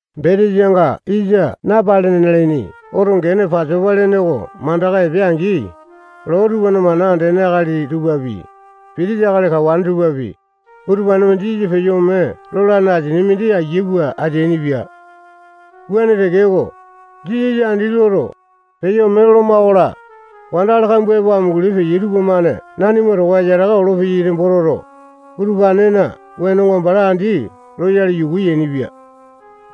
Betesanga yisa napalene nalaini oto gene Pasopa lene oko mandaka epeane-angi, loo tupana mana andene akali tupapi, pitisa akali kawane tupapi, utupane-mane Jisasa peyo ome lolane asia mindi ayia pua ateainipia. Wuane tekeko, Jisasa andi loto, peyo ome loloma-kola, wandakali kambua epo amunguli peyai tupamane nanima towa yataka olopeyai nembo toto, utupanena wenonga bala andi loyale yuku yainipia.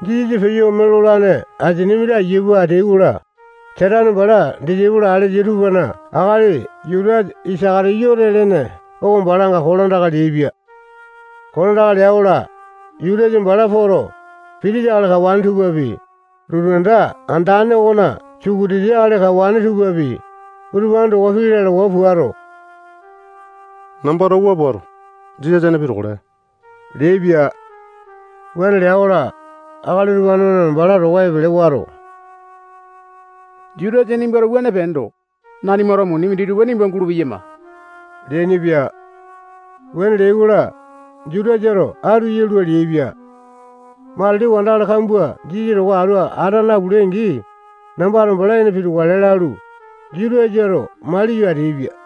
Jisasa peyo ome lolane asia mindi ayia pua ateai-kola, Satane bala disaipolo alesa tupana akali Jutasa Isaka-tiyote lene oko balanga kolandaka leaipia. Kolandaka lea-kola, Jutasa bala poto, pitisa akali kawane tupapi, lotu anda andane okona sukutiti akali kawane tupapi, utupane towa pii lalawa puato, nambato wua puato, Jisasa ene pitukale leaipia. Wuane lea-kola, akali utupane-mane bala towa epele wato, Jutasa nimbato wuane peendo, nanimato muni minditupa nimba gulupeyama leainipia. Wuane leai-kola, Jutasato atu yalua leaipia. Matili wandakali kambua Jisasa towa atu ata napulai-angi, nambato bala ene pitukale lalu, Jutasato maliyo ateaipia.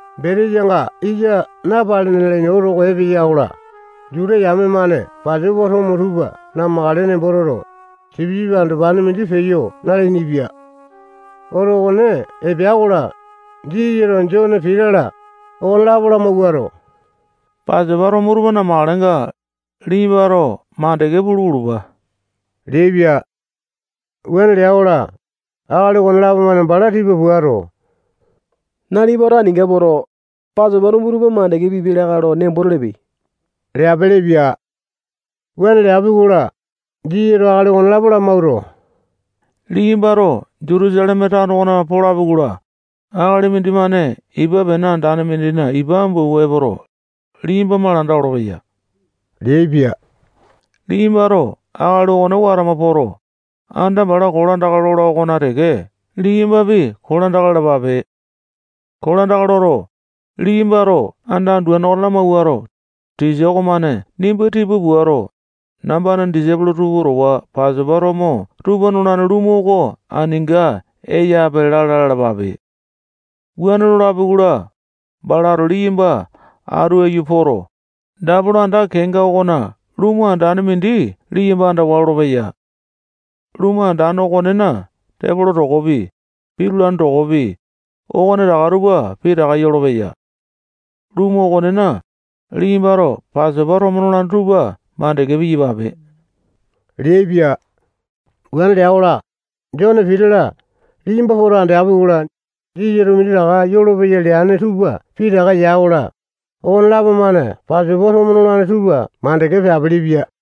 Betesanga yisa napalene nalaini oto oko epeya-kola, Juta yame-mane Pasopa tomo tupa namakale nembo toto, sipisipi andopane mindi peyo nalainipia. Oto okone epea-kola, Jisasato Jone, Pita-la, okonelapo lamawuato, Pasopa tomo tupa namakalenga, liyambato mandeke pulu pulupa leaipia. Wuane lea-kola, akali okonelapo-mane bala tipa puato, nalipato aninga poto, Pasopa tomo tupa mandeke pipiapi lakae lo nembo telepe leapelepia. Wuane leapi-kola, Jisasato akali okonelapo lamawuato, liyambato Jutusaleme tano okona polapi-kola, akali mindimane ipa pene andane mindina ipa ambu awua epoto, liyamba malanda olopeya leaipia. Liyambato akali okone watama poto, anda bala kolandaka lola okona teke liyambapi kolandaka lalapape. Kolandaka loto, liyambato anda anduane oko lamawuato, tisa okomane nimba tipa puato, nambana disaipolo tupa towa Pasopa tomo tupa nolane lumu oko aninga eyape lala lalapape. Wuane lolapi-kola, balato liyamba atu aiyu poto, dapolo anda kenga okona lumu andane mindi liyamba andawa lolopeya. Lumu andane okonena tepolo tokopi, pitulane tokopi, okonetaka tupa pitaka yolopeya. Lumu okonena, liyambato Pasopa tomo nolane tupa mandeke piyapape leaipia. Wuane lea-kola, Jone, Pita-la, liyamba poto andeapi-kola, Jisasato minditaka yolopeya leane tupa pitaka ya-kola, okonelapo-mane Pasopa tomo nolane tupa mandeke peapelepia.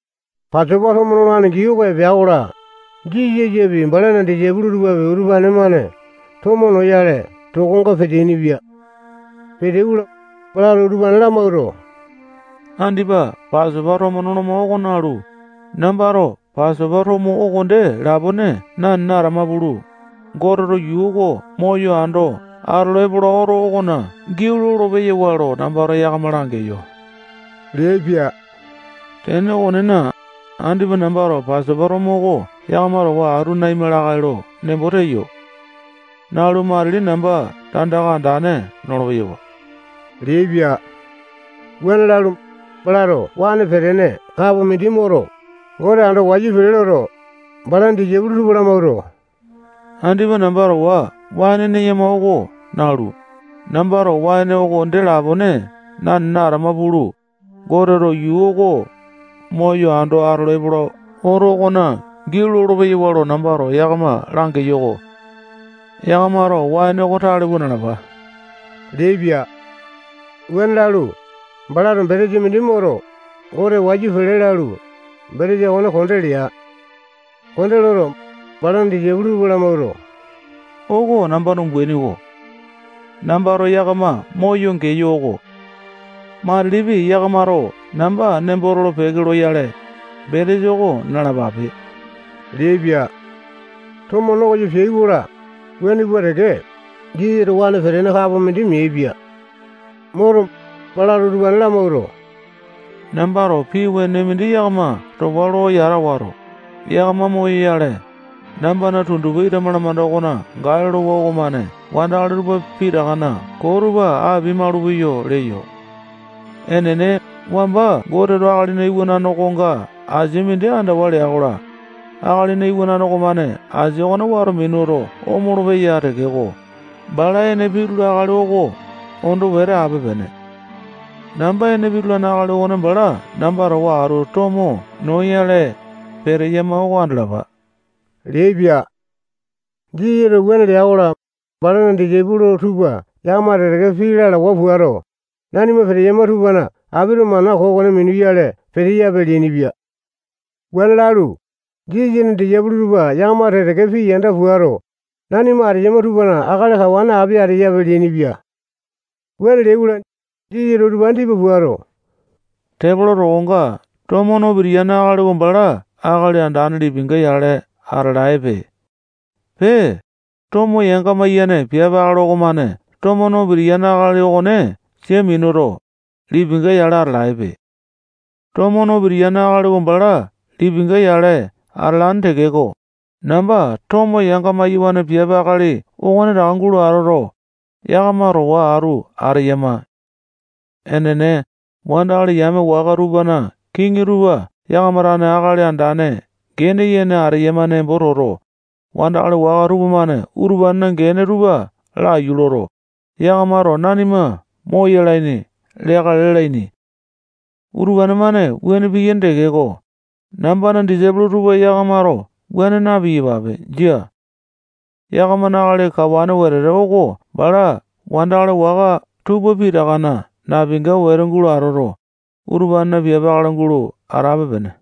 Pasopa tomo nolane gii oko epea-kola, Jisasapi, balana disaipolo tupapi, utupane-mane tomo noyale tokonga peteaini-pia. Peteai-kola, balato utupane lamawuato, andipa Pasopa tomo noloma oko nalu, nambato Pasopa tomo oko dee lapone nanene atama pulu, Goteto yuu oko moyo ando atolo epola oto okona giau lolo-peyawa lo nambato yakama langeyo leaipia. Tene okonena, andipa nambato Pasopa tomo oko yakama towa atu naima lakae lo nembo teyo. Nalu, matili namba tandaka andane nolo-peyawa leaipia. Wuane lalu, balato waene petene kapo mindi moto, Gote ando wayu pele loto, balana disaipolo tupa lamawuato, andipa namba towa waene neyama oko nalu, nambato waene oko dee lapone nanene atama pulu, Goteto yuu oko moyo ando atolo epola oto okona giau lolo-peyawa lo nambato yakama langeyo-ko. Yakamato waene oko tale pua nalapa leaipia. Wuane lalu, balato betesa mindi moto, Gote wayu pele lalu, betesa okone konde lea. Konde loto, balana disaipolo tupa mawuato, oko nambana umbaini oko. [Nambato yakama moyo geyo oko. Matilipi yakamato namba nembo tolo-peke loyale, betesa oko nalapape leaipia. Tomo no koyo peai-kola, wuane pua teke, Jisasato waene petene kapo mindi meaipia. Moto, balato utupane lamawuato, nambato pii wenene mindi yakama towa lo yata wato, yakama moyoyale, nambana tundupa ita malamanda okona gae lolowa okomane wandakali tupa pitakana koo tupa apia-maulupeyo leyo.] Enene, wamba Goteto Akalina Iwanane okonga asia mindi andawa lea-kola, Akalina Iwanane okomane asia okone wato minuto omolo-peya tekeko, bala ene pitula akali oko ondo wete ape-pene. Namba ene pitulane akali okone bala namba towa atu tomo noyale peteyama oko andalapa leaipia. Jisasato wuane lea-kola, balana disaipolo tupa yakama teke-teke pii lalawa puato, nanima peteyama tupana apito mana koo okone minuyale peteyape leainipia. Wuane lalu, Jisasana disaipolo tupa yakama teke-teke pii yanda puato, nanima ateyama tupana akali kawane api ateyape leainipia. Wuane leai-kola, Jisasato utupane tipa puato, tepolo tokonga tomo no pitiyane akali oko bala akali andane lipinga-yale atalaepe. Pee, tomo yanga-maiyane piape akali okomane tomo no pitiyane akali okone sia minuto, lipinga-yale atalaepe. Tomo no pitiyane akali oko bala lipinga-yale atalane tekeko, namba tomo yanga-maiyawane piape akali okonetaka gulo atoto, yakama towa atu ateyama. Enene, wandakali yame waka tupana kiŋi tupa yakama tane akali andane gene yene ateyama nembo toto, wandakali waka tupamane utupanena gene tupa laiyu loto, yakamato nanima moyalaini leakale lalaini. Utupane-mane wuane piyaini tekeko, nambana disaipolo tupa yakamato wuane na-piyapape. Jia. Yakamana akali kawane wetete oko bala wandakali waka tupa pitakana napinga wete gulo atoto, utupanena piape akali gulo atape-pene.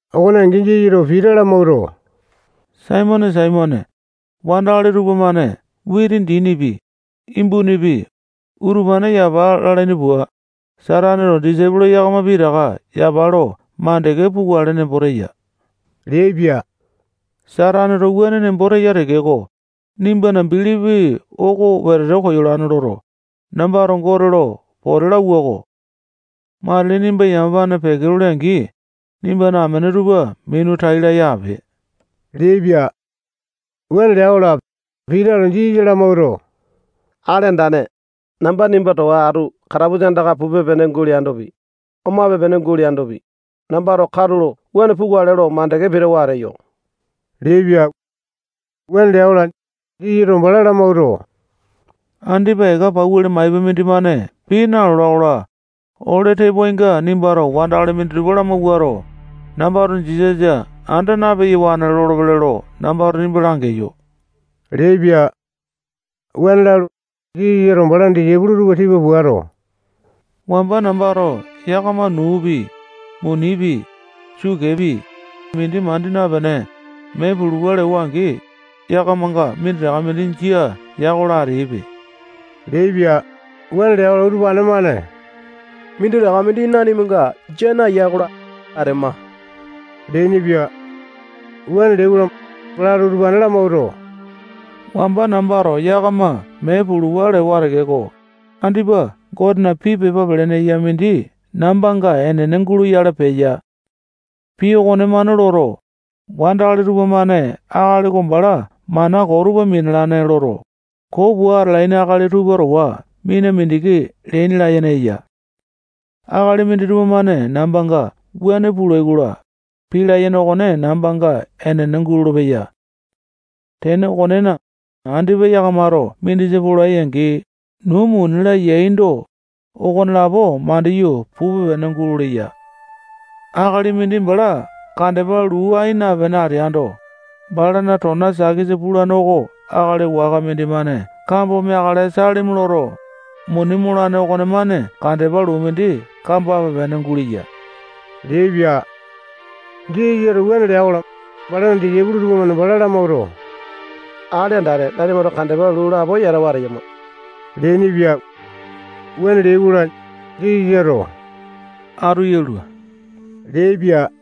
Okone angi, Jisasato Pita lamawuato, Saimone, Saimone, wandakali tupamane witi dinipi, imbunipi, utupane yapa lalaini pua, Sataneto disaipolo yakama pitaka yapa lo mandeke pukale nembo teya leaipia. Sataneto wuane nembo teya tekeko, nimbana bilipi oko wetete koyolane loto, nambato Gote lo pote lauwa-ko. Matili nimba yamapane peke lole-angi, nimbana amene tupa minu tai laya ape leaipia. Wuane lea-kola, Pitato Jisasa lamawuato, Akali Andane, namba nimba towa atu katapusa andaka pupe-pene guleandopi, omape-pene guleandopi, nambato katulo wuane pukale lo mandeke pitawa ateyo leaipia. Wuane lea-kola, Jisasato bala lamawuato, andipa eka pauli maipa mindimane pii nalola-kola, ole tepoainga nimbato wandakali minditupa lamawuato, nambato Jisasa anda na-peyawane lolopele lo nambato nimba langeyo leaipia. Wuane lalu, Jisasato balana disaipolo tupa tipa puato, wamba nambato yakama nuupi, munipi, sukepi, mindi mandi napene, mee pulupa lewa-angi, yakamanga minditaka mindi jia ya-kola ateaipe leaipia. Wuane lea-kola, utupane-mane minditaka mindi nanimanga jia naya-kola, atema leainipia. Wuane leai-kola, balato utupane lamawuato, wamba nambato yakama mee pulupa lewa tekeko, andipa Gotena pii pepa pelene eya mindi nambanga enene guloyale peya. Pii okonemane loto, wandakali tupamane akali oko bala mana koo tupa minalane loto, koo pua atalaini akali tupa towa mina mindiki leaini layene eya. Akali minditupa-mane nambanga wuane pulai-kola, pii layene okone nambanga enene gulolo-peya. Tene okonena, andipa yakamato mindisa polai-angi, nuu, muni-la, yaindo, okonelapo mandiyu pupe-pene guleya. Akali mindi bala kandepa luu ai napene ateaindo, balana tona sakesa pulane oko akali waka mindimane kambo meakale salimi loto, muni molane okonemane kandepa luu mindi kambape-pene guleya leaipia. Jisasato wuane lea-kola, balana disaipolo tupamane bala lamawuato, Akali Andane, nanimato kandepa luu lapo yatawa ateyama leainipia. Wuane leai-kola, Jisasato atu yalua leaipia.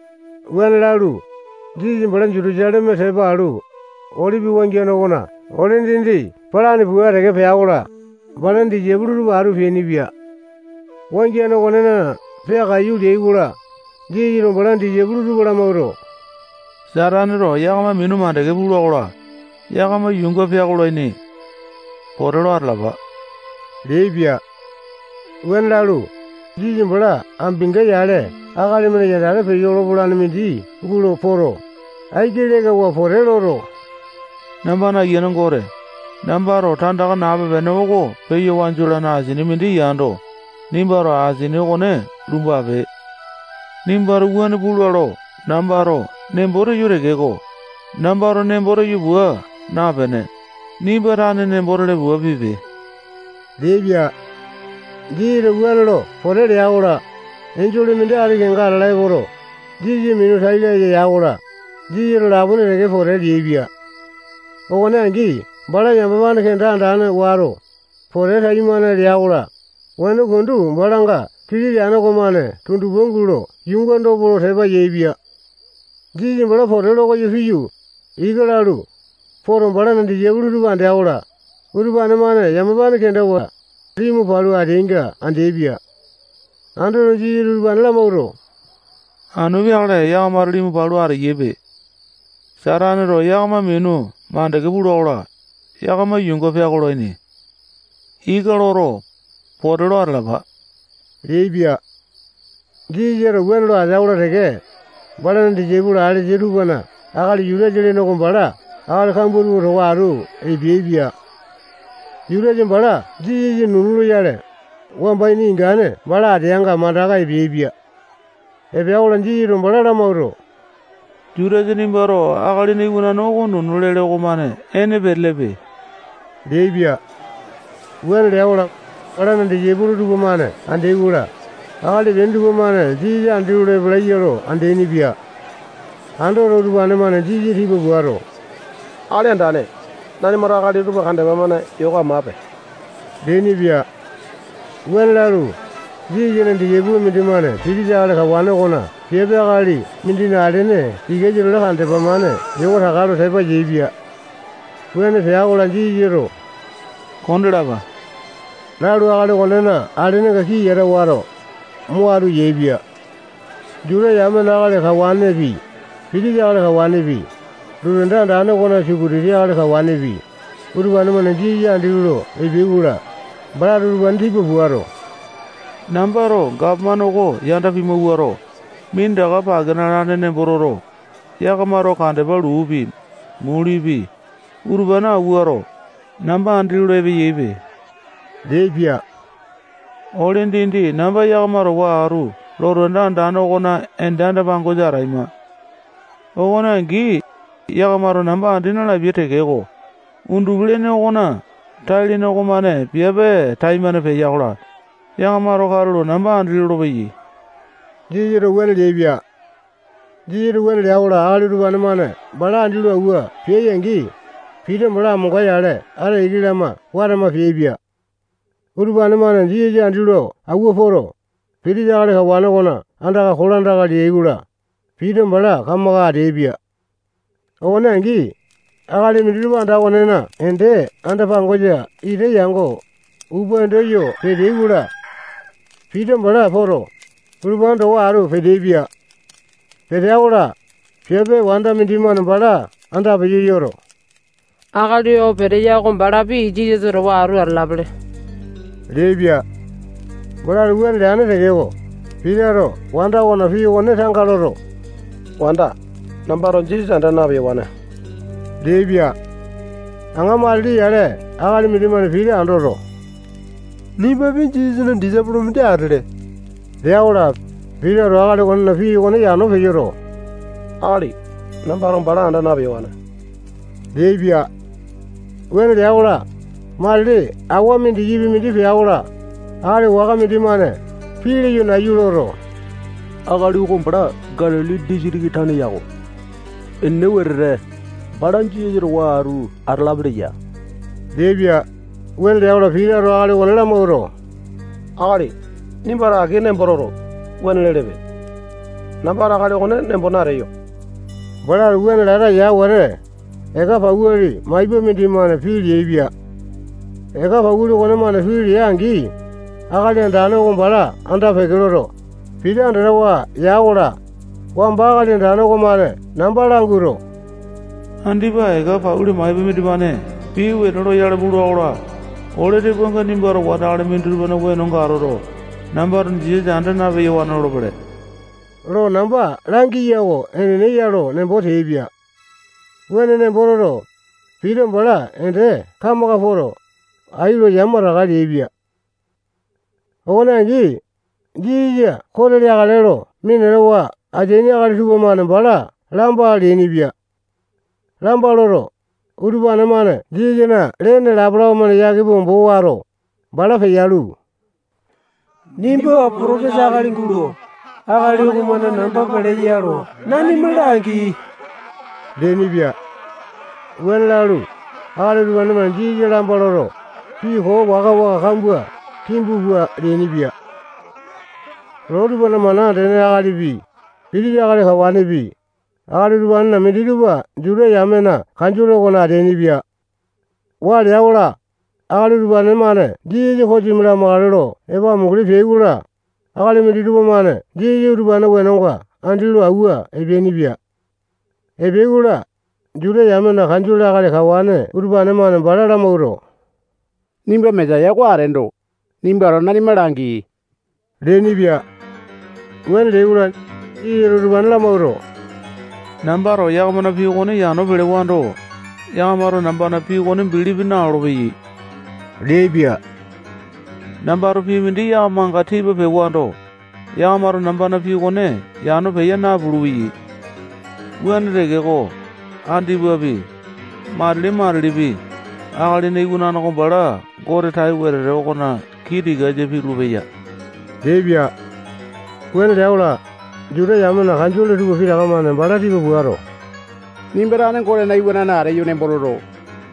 Wuane lalu, Jisasa bala Jutusaleme tepa alu, Olipi wangiane okona ole dindi palane pua teke pea-kola, balana disaipolo tupa atu peainipia. Wangiane okonena peakaiyu leai-kola, Jisasato balana disaipolo tupa lamawuato, Sataneto yakama minu mandeke pula-kola, yakama yuunga peakolaini. Pote lo atalapa leaipia. Wuane lalu, Jisasa bala ambinga-yale akali-mane yandate peyo lopape-pene mindi gulo poto, aiki lekawa pote loto, nambana Ayiane Gote, nambato tandaka nape-pene oko peya wanju olane asini mindi yando, nimbato asini okone lumbape. Nimbato wuane pula lo nambato nembo teyo tekeko, nambato nembo teyo pua napene, nimba tane nembo tele pua pipe leaipia. [Jisasato wuane lo pote lea-kola, enjole mindi ati kenga atala epoto, Jisasa minu tai laya ya-kola, Jisasato lapone teke pote leaipia. Okone angi bala yamapane kenda andane wato, pote taimane lea-kola, weno pundu balanga kili leane okomane tundupa gulo yuunga dopo lo tepa yaepia.] Jisasa bala pote lo koyo piyu, ika lalu poto, balana disaipolo tupa andea-kola, utupane-mane yamapane kendawa, limu palu ateaininga andeaipia. Andoto, Jisasato utupane lamawuato, anu peakale yakamato limu palu ateyaipe. Sataneto yakama minu mandeke pula-kola, yakama yuunga peakolaini. Ika loto, pote lo atalapa leaipia. Jisasato wuane lo atea-kola teke, balana disaipolo alesa tupana akali Jutasa lene oko bala akali kambua towa atu epeaipia. Jutasa bala Jisasa nunu loyale, wamba ini ingane bala ateanga mandaka epeaipia. Epea-kola, Jisasato bala lamawuato, Jutasa, nimbato Akalina Iwanane oko nunu lele okomane ene petelepe leaipia. Wuane lea-kola, balana disaipolo tupamane andeai-kola, akali epeaini tupamane Jisasa andi lolo epalaiya lo andeaini-pia. Andoto, utupane-mane Jisasa tipa puato, Akali Andane, nanimato akali utupa kandepa-mane yoko amape leainipia. Wuane lalu, Jisasana disaipolo mindimane pitisa akali kawane okona piape akali mindina alene tikasa-tole kandepa-mane yoko taka lo tepa yaepia. Wuane pea-kola, Jisasato kondalapa lalu, akali okonena alenenga kii yata wato, mo atu yaepia. Juta yamena akali kawanepi, pitisa akali kawanepi, lotu anda andane okona sukutiti akali kawanepi, utupane-mane Jisasa andi lolo epeai-kola, balato utupane tipa puato, nambato gapomane oko yanda pimawuato, minditaka pake nalane nembo toto, yakamato kandepa luupi, mulipi, utupane awuato, namba andi lolo epeyaipe leaipia. Ole dindi namba yakama towa atu lotu anda andane okona ende anda-pangosa ataima. Okone angi, yakamato namba andi nalapia tekeko, undupi-lene okona tai-lene okomane piape taimane peya-kola, yakamato katulo namba andi lolopeyai. Jisasato wuane leaipia. Jisasato wuane lea-kola, akali utupane-mane bala andi lo auwa peai-angi, Pita bala amonga-yale ata iki lama watama peaipia. Utupane-mane Jisasa andi lo auwa poto, pitisa akali kawane okona andaka kolandaka leai-kola, Pita bala kamaka ateaipia. Okone angi, akali minditupa anda okonena ende anda-pangosa ita yango, upa endo yo peteai-kola, Pita bala poto, utupane towa atu peteaipia. Petea-kola, piape wanda mindimane bala andapeyo yoto, akali oo peteya oko balapi Jisasa towa atu atalapele leaipia. Balato wuane leane tekeko, Pitato wanda okona pii okone tanga loto, wanda, nambato Jisasa anda na-peyawane leaipia. Aŋa matili yale akali mindimane Pita andoto, nimbapi Jisasana disaipolo mindi atele lea-kola, Pitato akali okonena pii okone yano peyoto, akali, nambato bala anda na-peyawane leaipia. Wuane lea-kola, matili awa mindikipi mindi pea-kola, akali waka mindimane pii leyo nayu loto, akali oko bala Galili disitiki tane yako. Enene wetete, bala Jisasa towa atu atalapele ya leaipia. Wuane lea-kola, Pitato akali okone lamawuato, akali, nimbato aki nembo toto, wuane lelepe. Nambato akali okone nembo nateyo. Balato wuane lata ya wete, eka pauli maipa mindimane pii leaipia. Eka pauli okonemane pii lea-angi, Akali Andane oko bala anda peke loto, Pita andatawa ya-kola, wamba Akali Andane okomane namba languato, andipa eka pauli maipa mindimane pii wene loyale pula-kola, ole tepoainga nimbato wandakali minditupana wenonga atoto, nambato Jisasa anda na-peyawane lolopele lo namba langiya oko enene ya lo nembo teaipia. Wuane nembo toto, Pita bala ende kamaka poto, ai lo yamataka leaipia. Okone angi, Jisasa kote leakale lo minatawa ateaini akali tupamane bala lamba leainipia. Lamba loto, utupane-mane Jisasana lene lapalapa-mane yake pua ombo wato, bala peyalu, nimba potopesa akali gulo, akali okomane namba peleya lo nanima langi leainipia. Wuane lalu, akali utupane-mane Jisasa lamba loto, pii koo waka-waka kambua kimbu pua leainipia. Loo tupana mana andene akalipi, pitisa akali kawanepi, akali utupanena minditupa Juta yamena kanjole okona ateainipia. Waa lea-kola, akali utupane-mane Jisasa kosimi lamakale lo epo amunguli peai-kola, akali minditupa-mane Jisasa utupanena wenonga andi lo awua epeainipia. Epeai-kola, Juta yamena kanjole akali kawane utupane-mane bala lamawuato, nimba Mesaya oko ateendo, nimbato nanima langi leainipia. Wuane leai-kola, Jisasato utupane lamawuato, nambato yakamana pii okone yano pelewando, yakamato nambana pii okone bilipi nalolo-peyai leaipia. Nambato pii mindi yakamanga tipa pewando, yakamato nambana pii okone yano peya napulu-peyai. Wuane tekeko, andipapi, matili-matilipi, Akalina Iwanane oko bala Gote tai wetete okona kii tikasa pitulu-peya leaipia. Wuane lea-kola, Juta yamena kanjole tupa pitaka-mane bala tipa puato, nimba tane Gotena Iwanane ateyo nembo toto,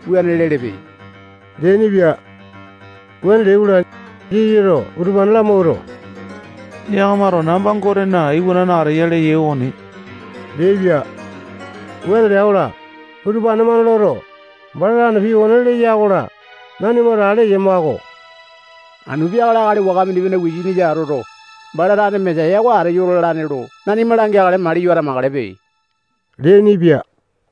wuane lelepe leainipia. Wuane leai-kola, Jisasato utupane lamawuato, yakamato namba Gotena Iwanane ateya leyai okoni leaipia. Wuane lea-kola, utupane-mane loto, bala tane pii okone leya-kola, nanimato ale eyama-ko. Anu peakale akali waka mindimane wisanisa atoto, bala tane Mesaya oko ateyo lalane lo nanima langeakale maliyo atamakalepe leainipia.